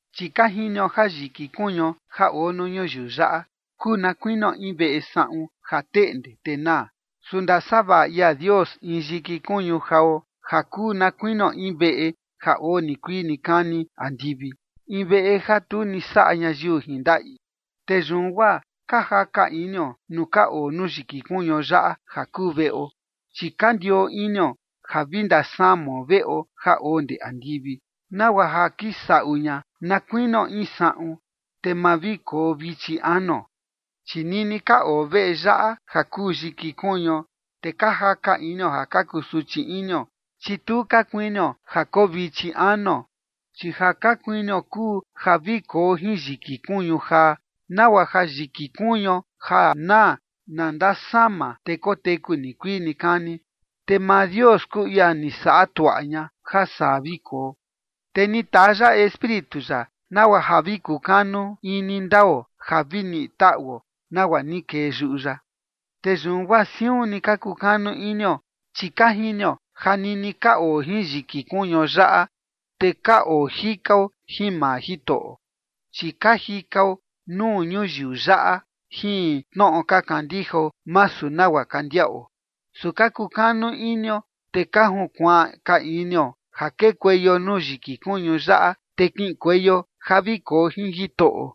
Chi ka jinio ja yiki kuñuo ja oo nuu ñuyiu yaꞌa kuu na kuinio in veꞌe saꞌun ja teꞌnde, te naa. Su ndasavaꞌa ia Dios in yiki kuñu jao ja kuu na kuinio in veꞌe ja oo nikuii nikani andivi, in veꞌe ja tu ni saꞌa ñayiu jin ndaꞌi. Te yun guaa ka jaka inio nuu ka oo nuu yiki kuñuo yaꞌa ja kuu veꞌo, chi ka ndioo inio ja vi ndasamao veꞌo ja oo ndee andivi, nagua ja kisaꞌu ña na kuinio in saꞌun, te ma vi koo vichi anuo. Chi nini ka oo veꞌe yaꞌa ja kuu yiki kuñuo, te ka jaka inio ja ka kusuchi inio, chi tu ka kuinio ja koo vichi anuo, chi ja ka kuinio kuu ja vi koo jin yiki kuñu jaa, nagua ja yiki kuñuo ja naa, na ndasama, te koteku nikuii nikani. Te maa Dios kuu ia ni saꞌa tuaꞌa ña ja saa vi koo, te ni taa ya Espíritu ya nagua ja vi kukanu ini ndao ja vi niꞌi taꞌuo nagua ni kee yuꞌu ya. Te yun guaa siun ni ka kukanu inio, chi ka jinio ja nini ka oo jin yiki kuñuo yaꞌa, te ka oo jikao jin maa Jitoꞌo. Chi ka jikao nuu ñuyiu yaꞌa jin tnoꞌo ka kandijao, masu nagua ka ndiaꞌo. Su ka kukanu inio, te ka junkuaan ka inio ja kekueio nuu yiki kuñu yaꞌa, te kiꞌinkueio ja vi koo jin Jitoꞌo.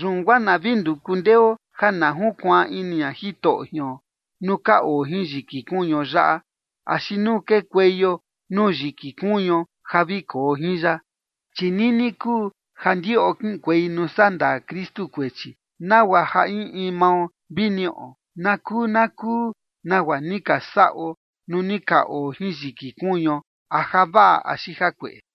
Yun guaa na vi nduku ndeo ja na junkuaan ini ña Jitoꞌo jion, nuu ka oo jin yiki kuñuo yaꞌa, axi nuu kekueio nuu yiki kuñuo ja vi koo jin ya. Chi nini kuu ja ndiꞌo kiꞌinkuei nuu sandaa Kristu kuechi, nagua ja in in mao vi niꞌo na kuu na kuu nagua ni ka saꞌo nuu ni ka oo jin yiki kuñuo, a javaꞌa axi jakueꞌe.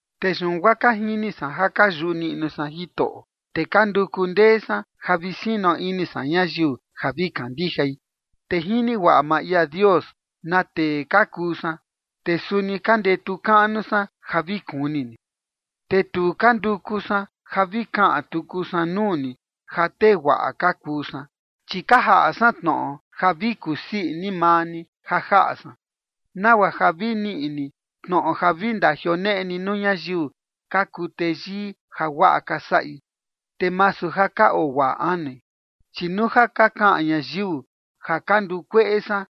Te yun guaa ka jini san ja ka yuꞌu niꞌnu san Jitoꞌo, te ka nduku ndee san ja vi sino ini san ñayiu ja vi kandijai. Te jini guaꞌa maa ia Dios na tee ka kuu san, te suni ka ndetu kaꞌnu san ja vi kuni ni. Te tu ka nduku san ja vi kaꞌan tuku san nuu ni ja tee guaꞌa ka kuu san, chi ka jaꞌa san tnoꞌo ja vi kusii ini maa ni ja jaꞌa san, nagua ja vi niꞌi ni tnoꞌo vi ndajioneꞌe ni nuu ñayiu ka kuu teyii ja guaꞌa ka saꞌi, te masu ja ka oo guaꞌa anui. Chi nuu ja ka kaꞌan ñayiu ja ka ndukueꞌe san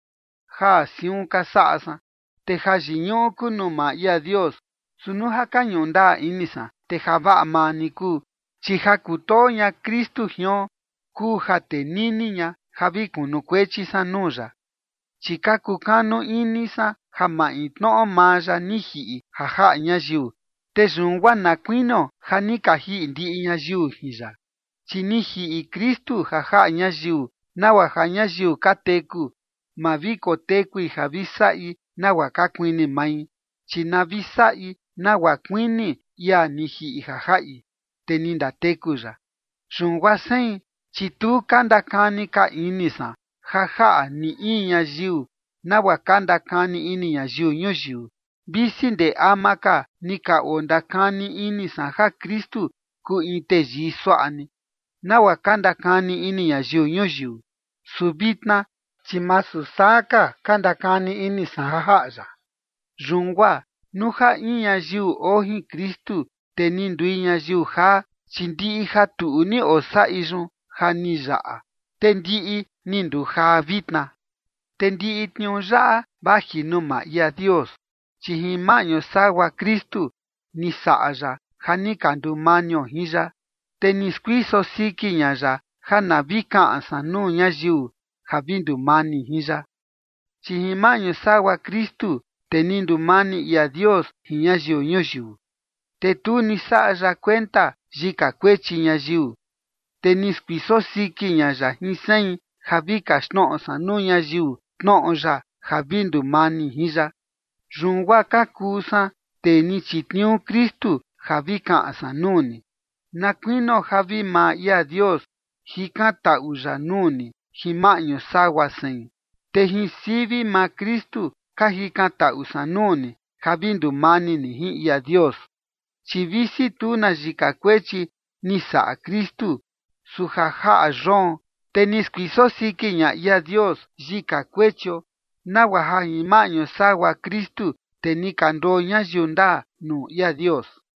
ja siun ka saꞌa san, te jayiñuꞌu kuu nuu maa ia Dios. Su nuu ja ka ñuꞌu ndaa ini san, te javaꞌa maa ni kuu. Chi ja kutoo ña Kristu jion kuu ja tenini ña ja vi kunukuechi san nuu ya, chi ka kukanu ini san ja maintnoꞌo maa ya ni jiꞌi ja jaꞌa ñayiu, te yun guaa na kuinio ja ni ka jiꞌi ndiꞌi ñayiu jin ya. Chi ni jiꞌi Kristu ja jaꞌa ñayiu, nagua ja ñayiu ka teku, ma vi kotekui ja vi saꞌi nagua ka kuini mai, chi na vi saꞌi nagua kuini ia ni jiꞌi ja jaꞌi, te ni ndateku ya. Yun guaa sein, chi tu ka ndakani ka ini san ja jaꞌa ni in ñayiu, nagua ka ndakani ini ñayiu ñuyiu, visi ndee ama ka ni ka ondakani ini san ja Kristu kuu in teyii suaꞌa ni, nagua ka ndakani ini ñayiu ñuyiu, su vitna chi masu saa ka ka ndakani ini san ja jaꞌa ya. Yun guaa nuu ja in ñayiu oo jin Kristu, te ni ndui ñayiu jaa, chi ndiꞌi ja tuꞌu ni osaꞌi yun ja ni yaꞌa, te ndiꞌi ni ndujaa vitna. Te ndiꞌi tniuu yaꞌa vaji nuu maa ia Dios, chi jin maꞌñu sagua Kristu ni saꞌa ya ja ni ka ndumanio jin ya, te ni skuiso siki ña ya ja na vi kaꞌan san nuu ñayiu ja vi ndumani jin ya. Chi jin maꞌñu sagua Kristu, te ni ndumani ia Dios jin ñayiu ñuyiu, te tu ni saꞌa ya kuenta yika kuechi ñayiu. Te ni skuiso siki ña ya jin sein ja vi kaxtnoꞌo san nuu ñayiu tnoꞌo ya ja vi ndumani jin ya. Yun guaa ka kuu san tee ni chitniuu Kristu ja vi kaꞌan san nuu ni, na kuinio ja vi maa ia Dios jikantaꞌu ya nuu ni jin maꞌñu sagua sein. Te jin sivi maa Kristu ka jikantaꞌu san nuu ni ja vi ndumani ni jin ia Dios. Chi visi tu na yika kuechi ni saꞌa Kristu, su ja jaꞌa yoon, te ni skuiso siki ña ia Dios yika kuechio, nagua ja jin maꞌñu sagua Kristu, te ni ka nduo ñayiu ndaa nuu ia Dios.